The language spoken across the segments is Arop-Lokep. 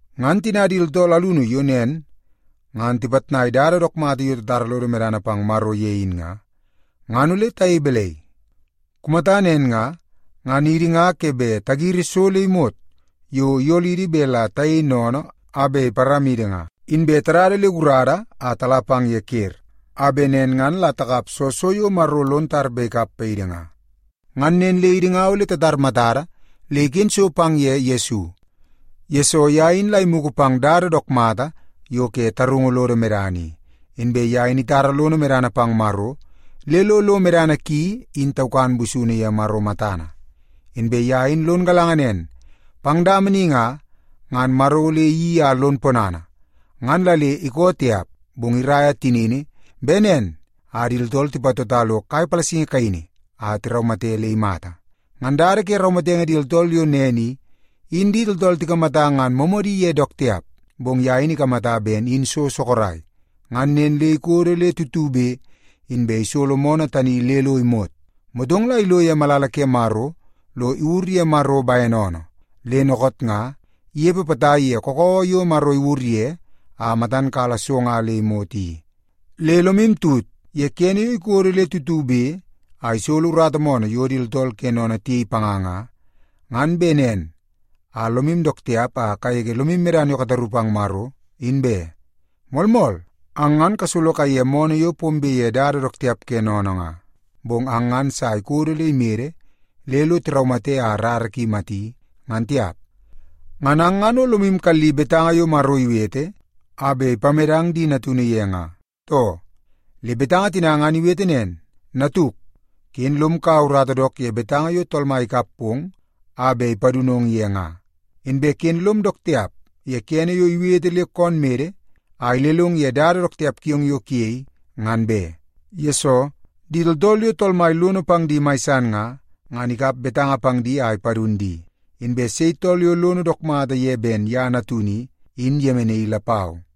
Ngan tina di tooltool alunu yo nen ngan tipitnai dada dook mata yo titara lodi medana pang Maro ye in nga, ngan ole tayei balai? Kumata nen nga, ngan idi nga ke bet tagiri so le imot yo iyolidi bet la tayei sennene a bet iparamidi nga, inbe tadada le gurada a tala pang ye ker, a bet nen ngan la takap soo so yo Maro lon tar bet ikap paidi nga. Ngan nen le idi nga ole tatar matada le iken so pang ye Yesu, yesoo ye in la imugu pang dada dook mata yo ke tarungu lodo medana i, inbe ye in itara lono medana pang Maro le lo medana ki in taukan busunu ye Maro matana. Inbe ye in lon galanga nen, pang dama ni nga, ngan Maro ole iyeii a lon ponana, ngan la le ikoo tiap, bong iraia tinini bet nen a di tooltool tipatota lo kai palasingi kaini a tiraumate le imata. Ngan dada ke raumatenge di tooltool yo nen i, in di tooltool tikamata ngan moomoodi ye dook tiap, bong ye in ikamata ben in so sorok, ngan nen le ikodo le tutube inbe isolo moonoo tani le lo imot. Motong la ilo ye malala ke Maro lo iwur ye Maro bene oonoo. Le dookoot nga, inepe potai ye kakawa yo Maro iwur ye a matan kala so nga le imot i. Le lomu tut ye kene yo ikodo le tutube a isolo urata moonoo yo di tooltool ke sennene tiyei panga nga, ngan bet nen a lomu dook tiap a kagege lomu medana yo kataru pang Maro, in be. Moolmool, ang ngan kasolo kaiye moonoo yo pombe ye dada dook tiap ke sennene nga, bong ang ngan sa ikodo le imede le lo tiraumate a rara ki imati, ngan tiap. Ngan ang ngan o lomu kalli betanga yo Maro iwete a bet ipamedang ang di natunu ye nga, too? Le betanga tina ngan iwete nen, “Natuk, ken lom kaua urata dook ye betanga yo Tool Mai ikap pong a bet ipadunong ye nga, inbe ken lom dook tiap ye kene yo iwete le koon mede a ilelong ye dada dook tiap kiong yo kuyei, ngan be. Yesoo, di tooltool yo Tool Mai lono pang di mai san nga, ngan ikap betanga pang di a ipadun di, inbe sei tool yo lono dook mata ye ben ye natunu i, in iyemenaii lapau.”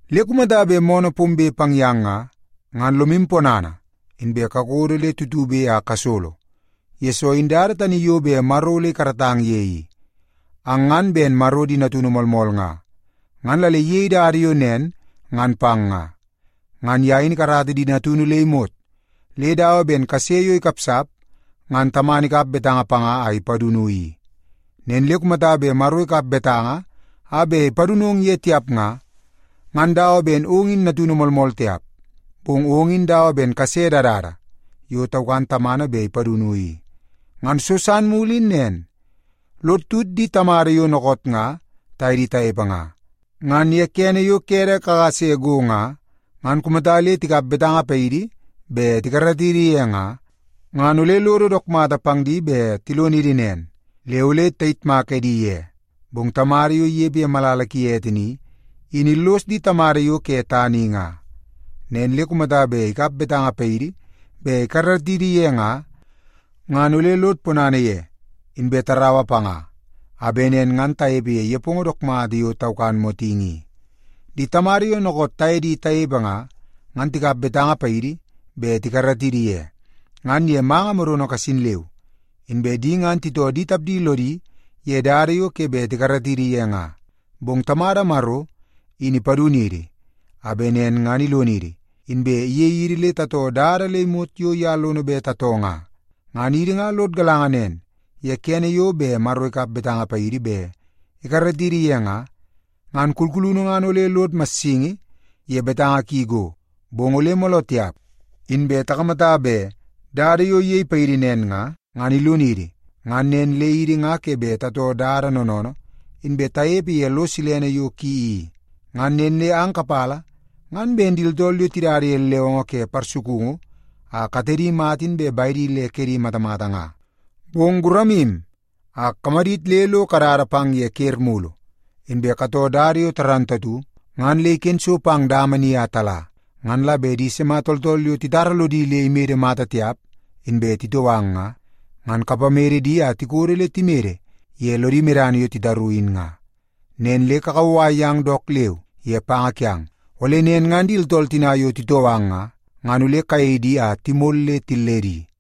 Le kumata bet moonoo pombe pang yang nga, ngan lomu ponana inbe kakodo le tutube a kasolo, yesoo in dada tani yo bet Maro ole ikaratang ye i. Ang ngan ben Maro di natunu moolmool nga, ngan la le iyei dada yo nen ngan pang nga. Ngan ye in ikarata di natunu le imot, le dawa ben kase yo ikapsap, ngan tamana ikap betanga panga a ipadunu i. Nen le kumata bet Maro ikap betanga a bet ipadunong ye tiap nga, ngan dawa ben ong in natunu moolmool tiap, bong ong in dawa ben kase dadada yo taukan tamana bet ipadunu i. Ngan so san mulu in nen. Lod tut di tamada yo dookoot nga taye di tanepe nga. Ngan ye kene yo kede kakase go nga, ngan kumata le tikap betanga paidi bet tikaratidi ye nga, ngan ole lodo dook mata pang di bet tilonidi nen, le ole tayitmak edi ye. Bong Tamada yo inepe ye malala ki ete ni, in illos di tamada yo ke tana i nga. Nen le kumata bet ikap betanga paidi bet tikaratidi ye nga, ngan ole lod ponana ye, inbe taraua panga a bet nen ngan tanepe ye nepongo dook mata yo taukan motingi i. Di tamada yo dookoot taye di tanepe nga, ngan tikap betanga paidi bet tikaratidi ye, ngan ye manga modono kasin leu. Inbe di ngan titoo di tapdi lodi ye dada yo ke bet tikaratidi ye nga. Bong Tamada Maro in ipadunidi, a bet nen ngan ilonidi, inbe iyei idi le tatoo dada le imot yo ye lono bet tatoo nga. Ngan idi nga lod galanga nen, ye kene yo bet Maro ikap betanga paidi bet ikaratidi ye nga, ngan kulkulunu ngan ole lod massingi ye betanga ki go. Bong ole mooloo tiap inbe takamata bet dada yo iyei paidi nen nga, ngan ilonidi ngan nen le idi nga ke bet tatoo dada noonoonoo, inbe tanepe ye lo silene yo ki i. Ngan nen le ang kapala ngan ben di tooltool yo tidada ye lewongo ke parsukungu a katedi mata inbe bedi le kedi matamata nga. Bong guramu a kamadit le lo kadada pang ye ker mulu. Inbe katoo dada yo dook mata ngan le iken so pang dama ni a tala. Ngan la bet di sima tooltool yo titara lodi le imede mata tiap, inbe titoo ang nga, ngan kapamede di a tikodo le timede ye lodi medana yo titaru in nga. Nen le kakauwai yang dook leu ye panga kiang, ole nen ngan di tooltool tina yo titoo ang nga, ngan ole kayei di a timol le tilledi.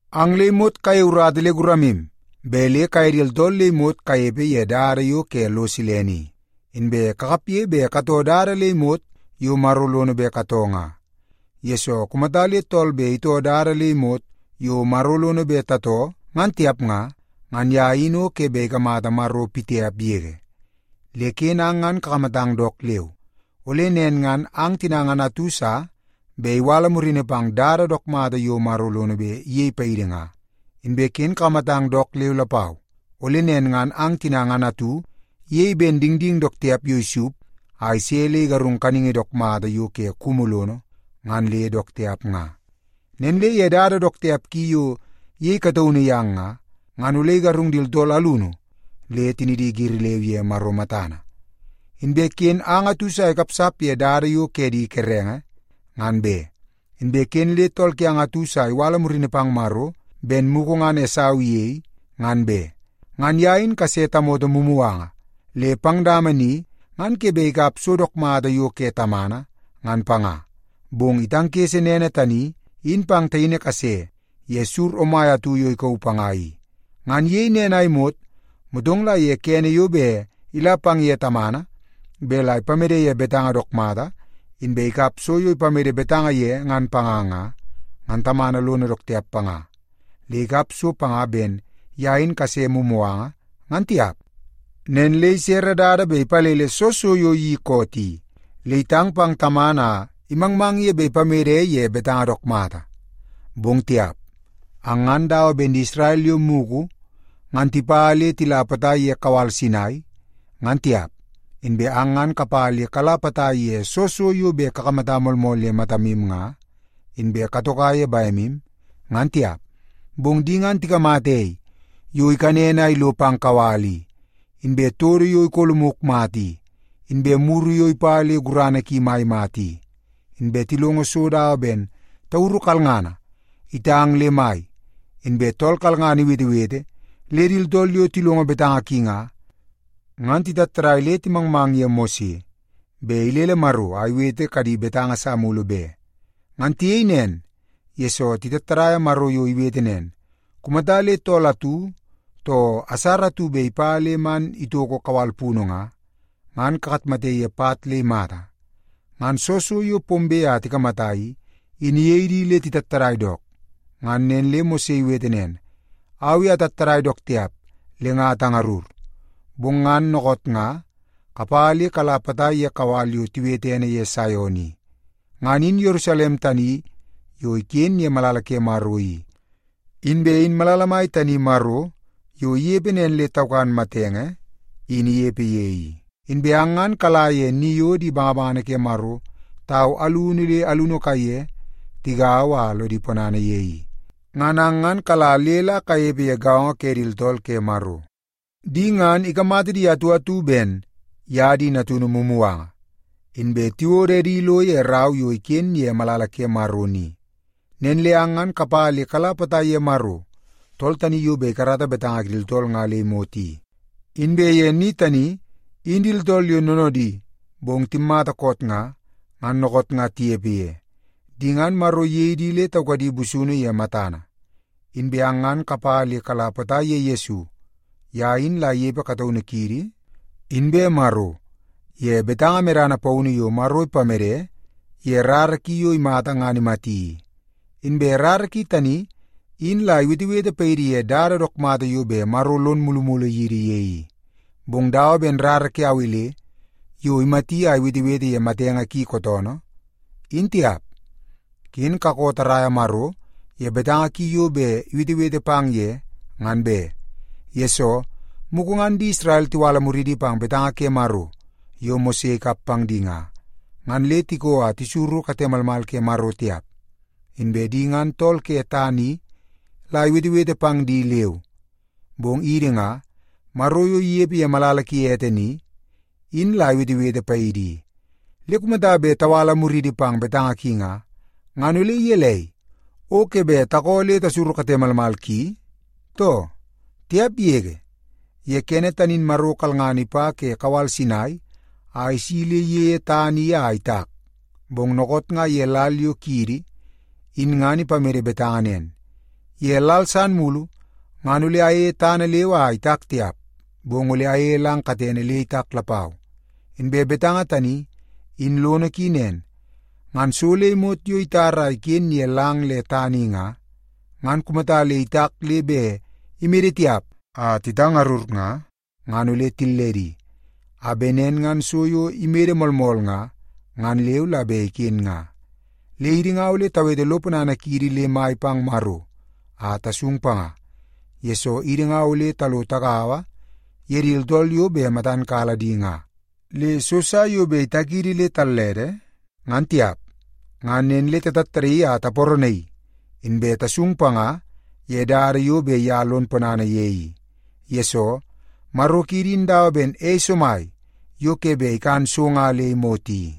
Ang le imot kayei urata le guramu bet le kaye di tooltool le imot kanepe ye dada yo ke lo silene i, inbe kakapge bet katoo dada le imot yo Maro lono bet katoo nga. Yesoo, kumata le tool bet itoo dada le imot yo Maro lono bet tatoo ngan tiap nga, ngan ye in o ke bet ikamata Tool Mai pitiap yege. Le ken ang ngan kakamatang dook leu, ole nen ngan ang tina ngan atu sa bet iwala murini pang dada dook mata yo Maro lono bet iyei paidi nga. Inbe ken kakamatang dook leu lapau, ole nen ngan ang tina ngan atu iyei ben dingding dook tiap yo isup a ise le igarung kaningi dook mata yo ke kumu lono ngan le dook tiap nga. Nen le ye dada dook tiap ki yo iyei kataunu yang nga, ngan ole igarung di tooltool alunu le tinidi giri leu ye Maro matana. Inbe ken ang atu sa ikapsap ye dada yo ke di kerenge, ngan be. Inbe ken le tool kiang atu sa iwala murini pang Maro ben mugu ngan Esau iyei, ngan be. Ngan ye in kase tamoto mumuganga le pang dama ni ngan ke bet ikap so dook mata yo ke tamana, ngan panga, bong itangkese nene tani in pang taini kase ye sur omai atu yo ikauu panga i. Ngan iyei nen a imot, motong la ye kene yo bet ila pang ye tamana bet la ipamede ye betanga dook mata, inbe ikap so yo ipamede betanga ye ngan panga nga, ngan tamana lono dook tiap panga, le ikap so panga ben ye in kase mumuganga, ngan tiap. Nen le isere dada bet ipalele soo so yo iyeii koot i, le itang pang tamana a imangmang ye bet ipamede ye betanga dook mata. Bong tiap! Ang ngan dawa ben di Isrel yo mugu ngan tipa le tila potai ye kawal Sinai, ngan tiap. Inbe ang ngan kapa le kala potai ye soo so yo bet kakamata moolmool ye matamu nga, inbe katoko ye bemu, ngan tiap. Bong di ngan tikamata ei yo ikanen a ilo pang kawal i, inbe todo yo ikolomuk mata i, inbe muru yo ipa le gurana ki mai mata i. Inbe tilongo so dawa ben tauru kalngana itang le mai, inbe tool kalngana iwetewete le di tooltool yo tilongo betanga ki nga, ngan titattadai le timangmang ye Mose bet ilele Maro a iwete kadi betanga sa mulu be. Ngan tiyei nen, yesoo titattadaia Maro yo iwete nen, “Kumata le tool atu, too asara atu bet ipa le man itoko kawal punu nga, ngan kakatmate ye pat le imata.” Ngan soo so yo pombe a tikamata i, in iyei di le titattadai dook. Ngan nen le Mose iwete nen, “Au i atattadai dook tiap le nga atangarur.” Bong ang ngan dookoot nga kapa le kala potai ye kawal yo tiwete ene ye Saion i. Ngan in Yerusalem tani yo iken ye malala ke Maro i, inbe in malala mai tani Maro yo inepe nen le taukan matenge, in inepe ye i. Inbe ang ngan kala ye ni yo di bangabangana ke Maro tau alunu le alunu kaiye tigaua a lodi ponana ye i. Ngan ang ngan kala le la kanepe ye gaongo ke di tooltool ke Maro. Di ngan, ikamata di atu atu ben ye di natunu mumuganga, inbe tiwodo edi ilo ye rau yo iken ye malala ke Maro ni. Nen le ang ngan kapa le kala potai ye Maro tool tani yo bet ikarata betanga ke di tooltool nga le imot i. Inbe ye ni tani, in di tooltool yo noonoodi bong timmata koot nga, ngan dookoot nga tinepe ye. Di ngan, Maro iyei di le taukadi busunu ye matana. Inbe ang ngan kapa le kala potai ye Yesu. Ye in la inepe kataunu kiidi inbe Maro ye betanga medana paunu yo Maro ipamede ye rara ki yo imata ngan imati i. Inbe rara ki tani in la iwetewete paidi ye dada dook mata yo bet Maro lon mulumulu yidi ye i, bong dawa ben rara ke Awel yo imati a iwetewete ye matenge ki kootoonoo, in tiap. Ken kakoo tarraia Maro ye betanga ki yo bet iwetewete pang ye, ngan be. Yesoo, mugu ngan di Isrel tiwala muridi pang betanga ke Maro yo Mose ikap pang di nga, ngan le tikoo a tisuru kate malmal ke Maro tiap. Inbe di ngan tool ke tana i la iwetewete pang di leu, bong idi nga, Maro yo inepe ye malala ki ete ni, in la iwetewete paidi i. Le kumata bet tawala muriidi pang betanga ki nga, ngan ole gelei, o ke bet takoo le tasuru kate malmal ki, too? Tiap yege! Ye kene tani in Maro kalngana ipa ke kawal Sinai a isi le iyeie tana i a itak. Bong dookoot nga ye lal yo kiidi in ngan ipamede betanga nen, “Ye lal san mulu, ngan ole ayeie tana leu a itak tiap, bong ole ayeie lang katene le itak lapau.” Inbe betanga tani, in lono ki nen. Ngan so le imot yo itar a iken ye lang le tana i nga, ngan kumata le itak le bet imede tiap a titangarur nga, ngan ole tilledi, a bet nen ngan so yo imede moolmool nga, ngan leu la bet iken nga. Le idi nga ole tawete lo ponana kiidi le mai pang Maro a tasung panga, yesoo idi nga ole talo tagaua ye di tooltool yo bet matan kala di nga, le so sa yo bet itakidi le tallede, ngan tiap. Ngan nen le tatattadaii a taparanaii, inbe tasung panga ye dada yo bet ye lo ponana ye i. Yesoo, Maro kiidi in dawa ben ei somai yo ke bet ikan so nga le imot i.